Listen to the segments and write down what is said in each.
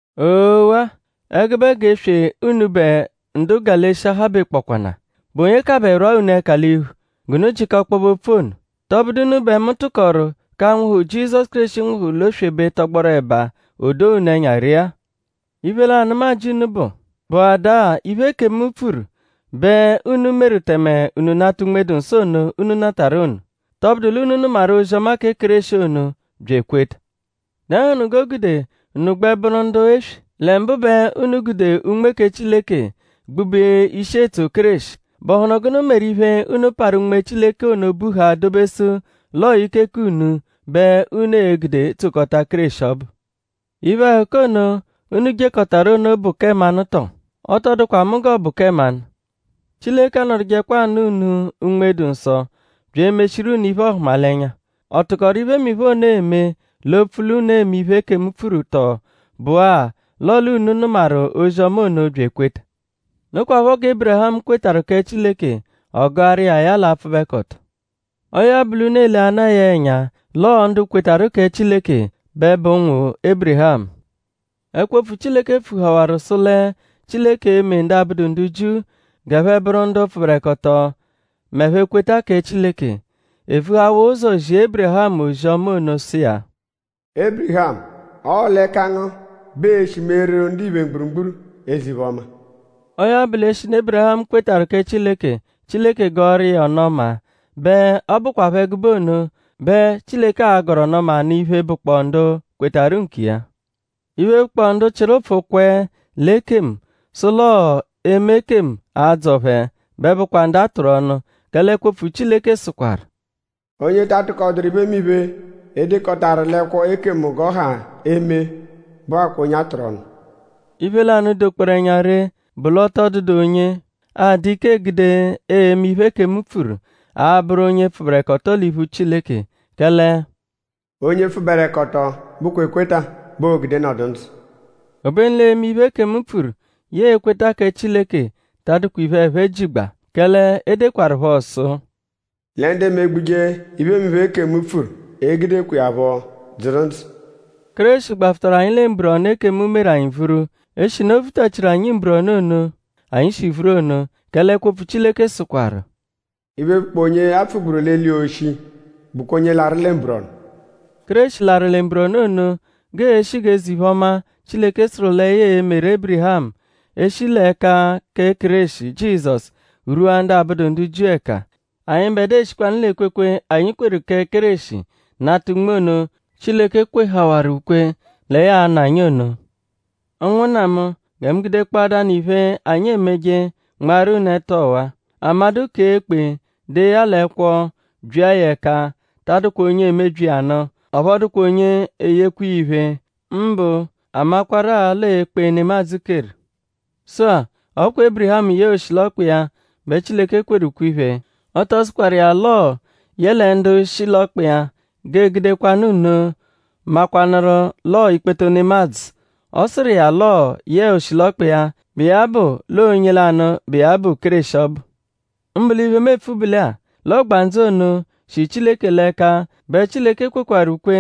Oo-waa! Ẹgube g'eswe unubẹ ndu Galeshiya habekpọkwana!?Bụ onye kabẹ rwaa unu ẹka l'iphu g'unu jịka ọkpobe opfu ono??Tọbudu unu bẹ mu tụkoru k'anwụhu, Jizọsu Kéreshi nwụhuru l'oswebe tọgboru ẹba; o doo unu ẹnya ree-a? Iphe lanụ, mu ajị unu bụ:?Bụada-a iphe, ekemu pfuru bẹ unu meru tẹme unu nata Unme-dụ-Nsọ ono, unu natarụ ono??Tọbudu l'unu nụmaru ozi-ọma kẹ Kéreshi ono bya ekweta? ?Dẹnuhunu g'o gude unu gbẹ bụru ndu eswe? Lẹ mbụ bẹ unu gude Unme kẹ Chileke gbube ishi etso Kéreshi.?Bụhunu gụnu meru iphe, unu parụ Unme Chileke ono buhaa dobesu l'ọo ike k'unu bẹ unu e-gude tsokọta Kéreshi ọbu? ?Iphe-ẹhuka ono, unu jekọtaru ono bụ kẹ mmanụ tọ? Ọ tọ dụkwa mu g'ọ bụ kẹ mmanụ. Chileke anọdujekwa anụ unu Unme-dụ-Nsọ bya emeshiru unu iphe-ọhumalenya.?Ọ tụkoru iphemiphe ono eme opfu l'unu eme iphe, ekemu pfuru tọo bụ-a l'ọle unu nụmaru ozi-ọma ono bya ekweta? Nokwaphọ gẹ Ébirihamu kwetarụ kẹ Chileke; ọ gụaru iya ya l'apfụbekoto. Ọo ya bụ l'unu eleana iya ẹnya; l'ọo ndu kwetarụ kẹ Chileke bẹ bụ ụnwu Ébirihamu. Ẹkwo-opfu Chileke pfuhawaru sụ lẹ Chileke e-me ndu abụdu ndu Jiu g'ẹphe bụru ndu pfụberekoto m'ẹphe -kweta kẹ Chileke. E vuhawaa ụzo zia Ébirihamu ozi-ọma ono sụ iya: “Ébirihamu; ọo l'ẹka ngu bẹ e-shi meeru ndiphe mgburugburu eze-iphe-ọma.” Ọo ya bụ; l'eshinu Ébirihamu kwetarụ kẹ Chileke; Chileke gọoru iya ọnu-ọma; bẹ ọ bụkwapho ẹgube ono bẹ Chileke a-gọru ọnu-ọma nụ iphe, bụkpoo ndu kwetarụ nkiya. Iphe, bụkpoo ndu chịru ụpfu kwẹe l'ekemu sụ l'ọo eme ekemu a-dzọ phẹ bẹ bụakwaa ndu a tụru ọnu. Kẹle ẹkwo-opfu Chileke sụkwaru: “Onye ta atụkoduru iphemiphe, e dekọtaru l'ẹkwo ekemu g'ọ ha eme bụakwaa onye a tụru ọnu.” Iphe lanụ, dokpọoru ẹnya ree bụ l'ọ tọ dụdu onye a-dụ ike egude eme iphe, ekemu pfuru abụru onye pfụberekoto l'iphu Chileke. Kẹle “Onye pfụberekoto bụkwa ekweta bẹ oo-gude nọdu ndzụ.” Obenu l'eme iphe ekemu pfuru yẹe ekweta kẹ Chileke ta adụkwa iphe, ẹphe jigba; kẹle e dekwaruphọ sụ: “Lẹ ndu emegbuje iphemiphe, ekemu pfuru e-gudekwa iya phọ dzụru ndzụ.” Kéreshi gbafụtaru anyi lẹ mburọnu, ekemu meru anyi vuru; eshinu o vutachiru anyi mburọnu ono anyi shi vuru ono. Kẹle ẹkwo-opfu Chileke sụkwaru: “Iphe, bụkpoo onye a pfugburu l'eli oshi bụkwa onye larụ lẹ mburọnu.” Kéreshi larụ lẹ mburọnu ono g'ee-shi g'eze-iphe-ọma, Chileke sụru lẹ ya e-meru Ébirihamu eshi l'ẹka kẹ Kéreshi Jizọsu rwua ndu abụdu ndu Jiu ẹka. Anyịbedua e-shikwanụ l'ekwekwe, anyi kweru kẹ Kéreshi nata Unme ono, Chileke kwehawaru ukwe lẹ ya a-nụ anyi ono. Ụnwunna mu; gẹ mu gudekpọadanu iphe, anyi emeje nmaaru unu ẹtu ọwa-a. Amadụ -kee ekpe dee ya l'ẹkwo byia ya ẹka ta adụkwa onye emebyi iya nụ; ọphu ọ dụkwa onye eyekwa iya iphe; mbụ a makwarụ-a l'ọo ekpe, nemadzụ keru. Sụ-a; ọ kwa Ébirihamu yẹe oshilọkpa iya bẹ Chileke kweru ukwe-iphe. Ọ tọ sụkwaru iya l'ọo yẹle ndu shi l'ọkpa iya; g'ee-gudekwanụ nno makwanụru l'ọo ikpoto nemadzụ. Ọ sụru iya l'ọo yẹe oshilọkpa iya, bụ iya bụ l'ọo onye lanụ, bụ iya bụ Kéreshi ọbu. Mbụ l'iphe, mu epfu bụ lẹ-a; l'ọgbandzu ono, shi Chileke l'ẹka bẹ Chileke kwetarụ ukwe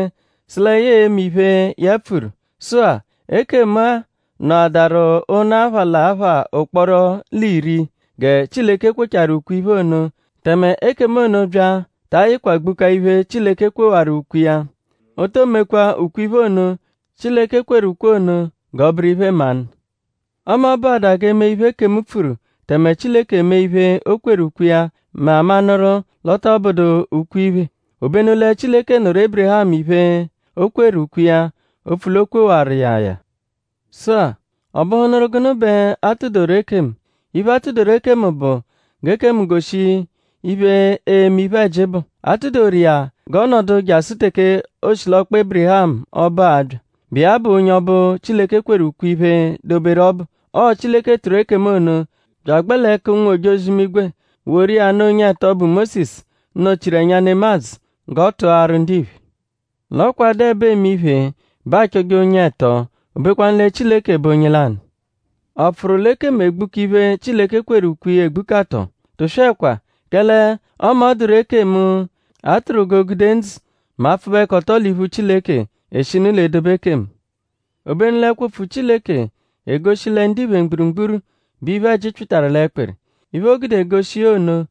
sụ lẹ ya e-me iphe ya pfuru. Sụ-a; ekemu, a nọadaru ụnu apha l'apha ụkporo l'iri gẹ Chileke kwechaaru ukwe-iphe ono tẹme ekemu ono bya ta ayịkwa gbukaa iphe, Chileke kwewaru ukwe iya. O to mekwa ukwe-iphe ono, Chileke kweru ono g'ọ bụru iphe-mmanụ. Ọme ọ bụada g'e me iphe, ekemu pfuru tẹme Chileke emee iphe, o kweru ukwe iya mẹ aamanụru l'ọ tọ bụedu ukwe-iphe. Obenu lẹ Chileke nụru Ébirihamu iphe, o kweru ukwe iya; opfu l'o kwewaru iya ya. Sụ-a;?ọ bụhunuru gụnu bẹ a tụ-doru ekemu? Iphe, a tụ-doru ekemu bụ g'ekemu goshi iphe eme iphe-ẹji bụ. A tụ-doru iya g'ọ nọdu jasụ teke oshilọkpa Ébirihamu ọbu a-bya, bụ iya bụ onye ọbu, Chileke kweru ukwe-iphe doberu ọbu. Ọo Chileke tụru ekemu ono bya agbẹ l'ẹka ụnwu-ojozi-imigwe woru iya nụ onye-ẹto bụ Mósisu, nọ-chiru ẹnya nemadzụ g'ọ tụaru ndiphe. L'ọ kwa a -dụ ẹbo eme iphe bẹ aachọje onye-ẹto; obekwanu lẹ Chileke bụ onye lanụ. ?Ọ pfụru l'ekemu egbuka iphe, Chileke kweru ukwe iya egbuka tọ? Tụswekwa! Kẹle ọme ọ -dụru ekemu, a tụru g'o gude ndzụ mẹ apfụbekoto l'iphu Chileke eshinu l'edobe ekemu. Obenu l'ẹkwo-opfu Chileke egoshi lẹ ndiphe mgburugburu bẹ iphe-ẹji pyịtaru l'ẹkpiri. Iphe, o gude egoshi iya ono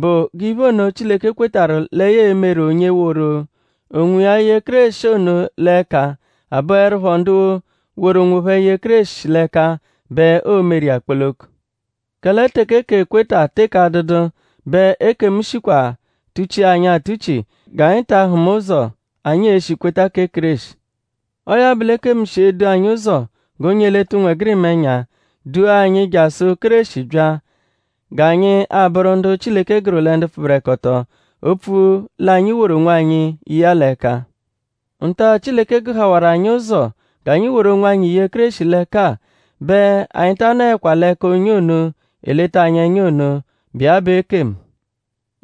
bụ g'iphe ono, Chileke kwetarụ lẹ ya e-meru onye woru onwiya ye Kéreshi ono l'ẹka abụerupho ndu woru onwophẹ ye Kéreshi l'ẹka bẹ oo-meru iya kpoloko. Kẹle teke k'ekweta teke adụdu bẹ ekemu shikwa tuchia anyi atuchi g'anyi ta ahụma ụzo anyi e-shi kweta kẹ Kéreshi. Ọo ya bụ l'ekemu shi edu anyi ụzo g'onye eleta ụnwegirima ẹnya; dua anyi jasụ Kéreshi bya g'anyi a-bụru ndu Chileke gụru lẹ ndu pfụberekoto; opfu l'anyi woru onwanyi ye iya l'ẹka. Nta-a, Chileke gụhawaru anyi ụzo g'anyi woru onwanyi ye Kéreshi l'ẹka-a bẹ anyi ta nọekwa l'ẹka onye ono, eleta anyi ẹnya ono, bụ iya bụ ekemu.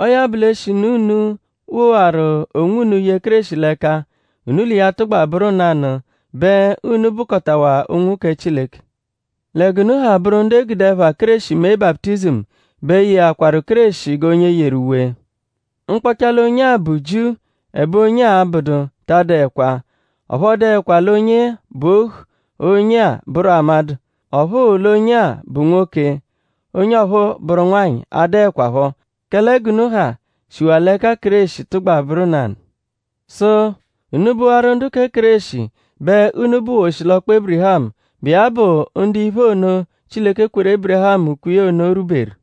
Ọo ya bụ; l'eshinu unu wowaru onwunu ye Kéreshi l'ẹka; unu l'iya tụgba bụru nanụ bẹ unu bụkotawa ụnwu kẹ Chileke. Lẹ g'unu ha bụru ndu e gude ẹpha Kéreshi mee baputizimu bẹ yeakwaru Kéreshi g'onye yeru uwe. Mkpọcha l'onye-a bụ Jiu ẹbe onye-a abụdu ta adụekwa; ọphu ọ dụekwa l'onye-a bụ ohu; onye-a bụru amadụ; ọphu l'onye-a bụ nwoke onye ọphuu bụru nwanyị adụekwapho; kẹle g'unu ha shiwaa l'ẹka Kéreshi tụgba bụru nanụ. Sụ: unu -bụwaru ndu kẹ Kéreshi bẹ unu bụwaa oshilọkpa Ébirihamu, bụ iya bụ ndu iphe ono, Chileke kweru Ébirihamu ukwe iya ono rwuberu.